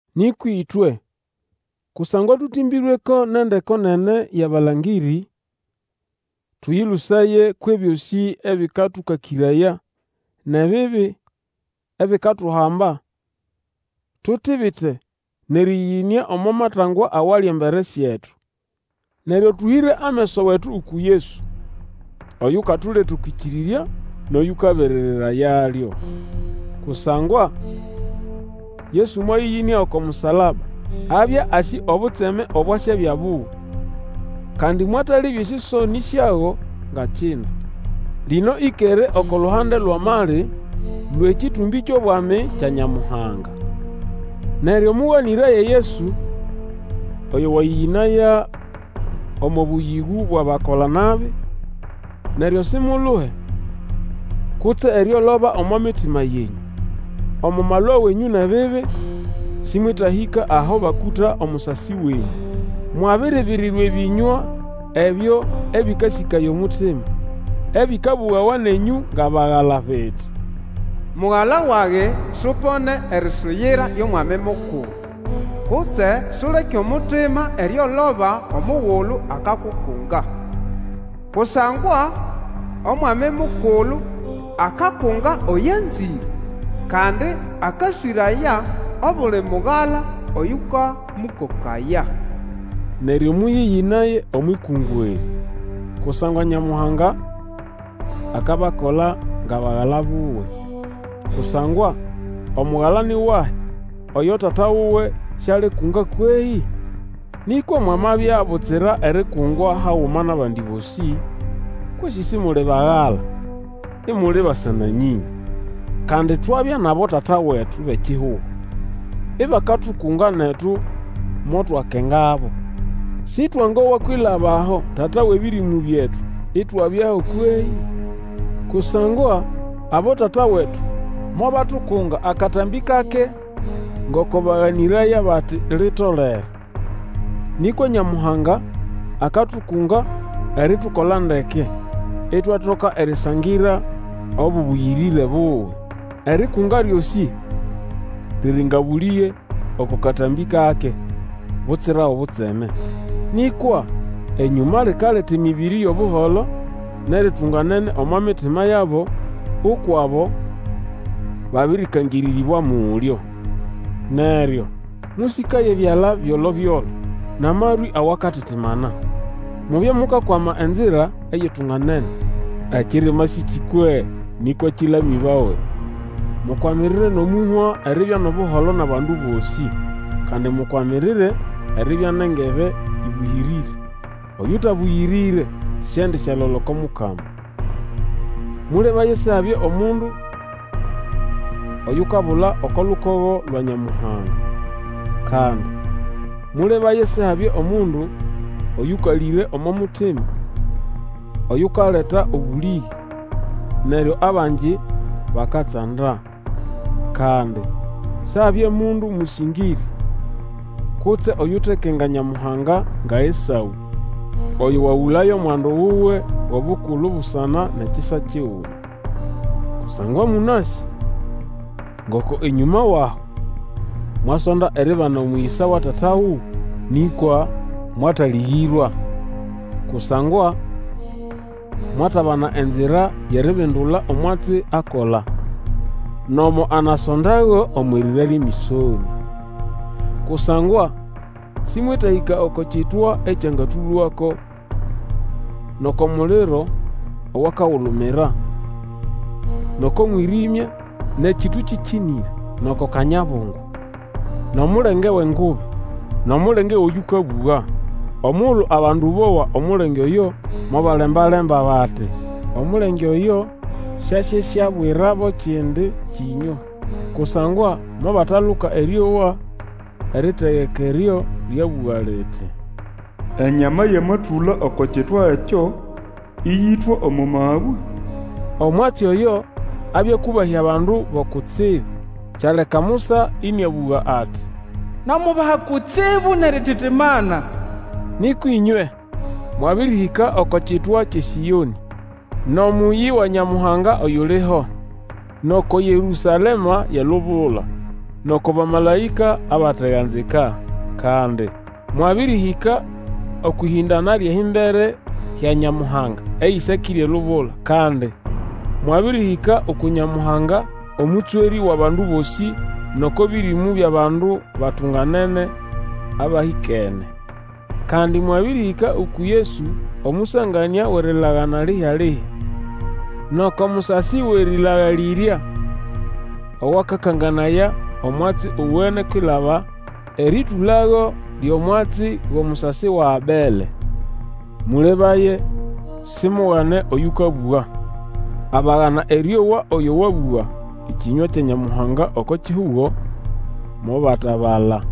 Nĩkwa ĩtwe, kusangwa tũtĩmbĩrweko nʼendeko nene yʼabalangĩrĩ, tũyĩlũsaye kwʼebyosĩ ebĩkatũkakĩraya, nʼebibi ebikatuhamba, tutibite nʼerĩyĩyĩnĩa omo matangwa awali embere syetu. Neryo tũhĩre ameso wetu uku Yesu oyukatuleta okwʼĩkĩrĩrya nʼoyũkaberererayalyo. Kusangwa Yesu mwayĩyĩnĩa oko musalaba, abya asĩ obutseme obwasyabya buwe, kandi mwatalebya esĩsonĩ syago nga kindu. Lino ĩkere oko luhande lwʼamali lwʼekĩtũmbĩ kyʼobwami kya Nyamuhanga. Neryo mũganĩraye Yesu oyo wayĩyĩnaya omo bũyĩgũ bwʼabakola-nabi, neryo simuluhe kutse erioloba omo mitima yenyũ. Omo malwa wenyũ nʼebibi, sĩmwetahĩka aho bakũta omusasi wenyũ. Mwabiribirirwa ebĩnywa ebyo ebĩkasĩkaya omutima, ebĩkabũgawa nenyũ ngʼabagala biti, Mugala wage, supone erisuyira lyʼOmwami Mukulu, Kutse Suleke omutima erioloba omugulu akakukunga. Kusangwa Omwami Mukulu akakunga oyo anzĩre, Kandi akaswĩraya obuli mugala oyũkamũkokaya. Neryo mũyĩyĩnaye omwʼikungwa erĩ, kusangwa Nyamuhanga akabakola ngʼabagala buwe. Kusangwa omugala ni wahi oyo tata wuwe sialikunga kwehĩ? Nĩkwa mwamabya butsira erikungwa haguma nʼabandi bosĩ, kwesĩ isimuli bagala, imuli basa-na-nyĩnya. Kandi twabya nʼabotata wetu bʼekihugo ibakatukunga, netu motwakengabo. Sĩtwangowa kwilaba aho Tata wʼebĩrĩmũ byetu, itwabyaho kwehĩ? Kusangwa abotata wetu mobatukunga akatambĩ kake ngoko baganĩraya bati litolere. Nĩkwa Nyamuhanga akatukunga eritukola ndeke, itwatoka erisangira obũbũyĩrĩre buwe. Erikunga lyosĩ riri nga bũlĩge oko katambĩ kake, butsira obutseme. Nĩkwa enyũma likaleta emĩbĩrĩ yʼobuholo nʼeritunganene omo mitima yabo, ukwʼabo babĩrĩkangĩrĩrĩbwa mulyo. Neryo mũsĩkaye ebyala byolobyolo nʼamarwĩ awakatitimana! Mubye mukakwama enzira eyitunganene, ekirema sĩkĩkwe, nĩkwa kĩlamĩbawe. Mukwamirire nʼomũhwa eribya nʼobuholo nʼabandu bosĩ, kandi mukwamirire eribya nʼengebe ĩbũyĩrĩre. Oyũtabũyĩrĩre siendisyalola oko Mukama. Mũlebaye Sihabye omundu oyukabula oko lukogo lwa Nyamuhanga. Kandi mũlebaye Sihabye omundu oyũkalĩre omo mutima, oyukaleta obũlĩge, neryo abangi bakatsanda. Kandi Sihabye mundu mũsĩngĩrĩ, kutse oyutekenga Nyamuhanga nga Esaũ, oyo wagũlaya omwandu wuwe wʼobukulu busana nʼekisa kiguma. Kusangwa mũnasĩ ngoko enyũma wʼaho, mwasonda eribana omũyĩsa wa tata wuwe nĩkwa mwatalĩgĩrwa. Kusangwa mwatabana enzira yʼeribindula omwatsi akola, nomo anasondayago omwʼirira lyʼemĩsonĩa. Kusangwa sĩmwetahĩka oko kitwa ekyangatũlwako, nʼoko muliro owakagulumira, nʼoko mwĩrĩmya nʼekĩtũ kĩkĩnĩre, nʼoko kanyabungu, nʼomulenge wʼengubi, nʼomulenge wʼoyũkabũga. Omugulu abandu bowa omulenge oyo mobalemba-lemba bati, omulenge oyo syasyeswabwirabo ekindi kĩnywa. Kusangwa mobataluka erĩowa eritegeka eryo lyabũga liti, Enyama yamatũla oko kitwa ekyo, ĩyĩtwa omo mabwe. Omwatsi oyo abya akũbahya abandu bo kutsibu. Kyaleka Musa ĩnĩabũga ati, Namubaha kutsibu nʼerititimana. Nĩkwa ĩnywe mwabĩrĩhĩka oko kitwa kyʼeSĩonĩ, nʼomũyĩ wa Nyamuhanga oyuliho, nʼoko Yerũsalema yʼelubula, nʼoko bamalaĩka abateganzika. Kandi mwabĩrĩhĩka okwʼĩhĩndana lyʼehimbere hya Nyamuhanga, ehĩsakĩre elubula, kandi mwabĩrĩhĩka uku Nyamuhanga Omũtswerĩ wʼabandu bosĩ, nʼoko bĩrĩmũ byʼabandu batunganene abahĩkene. Kandi mwabĩrĩhĩka uku Yesu omũsanganĩa wʼerilagana lihya-lihya, nʼoko musasi owʼerĩlagalĩrya, owakakanganaya omwatsi owene kwilaba erĩtũlago lyʼomwatsi gʼomusasi wa Abele. Mũlebaye simugane oyũkabũga. Abagana erĩowa oyo wabũga ekĩnywa kya Nyamuhanga oko kihugo, mobatabala.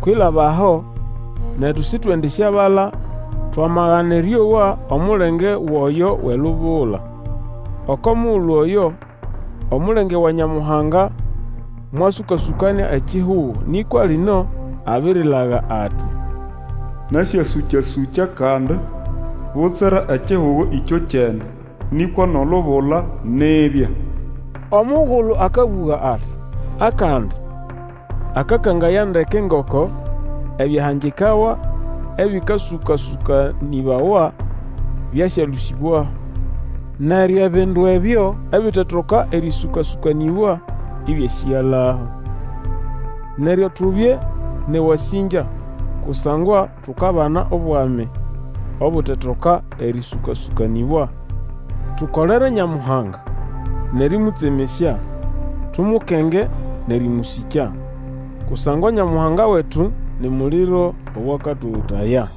Kwilaba aho netu sitwendisyabala twamagana erĩowa omulenge wʼoyo wʼelubula. Oko mugulu oyo, omulenge wa Nyamuhanga mwasũka-sũkanĩa ekihugo, nĩkwa lino abirilaga ati, Nasyasũka-sũkya kandi, butsira ekihugo ĩkyokyene, nĩkwa nʼolubula nibya. Omugulu akabũga ati, Akandi, akakangaya ndeke ngoko ebyahangikawa ebĩkasũka-sũkanĩbawa byasyalũsĩbwaho, neryo ebindu ebyo ebitetoka erĩsũka-sũkanĩbwa ĩbyasĩgalaho. Neryo tubye nʼewasĩngya, kusangwa tukabana obwami obutetoka erĩsũka-sũkanĩbwa. Tukolere Nyamuhanga nʼerĩmũtsemesya, tumukenge nʼerĩmũsĩkya. Kusangwa Nyamuhanga wetu ni muliro owakatogotaya.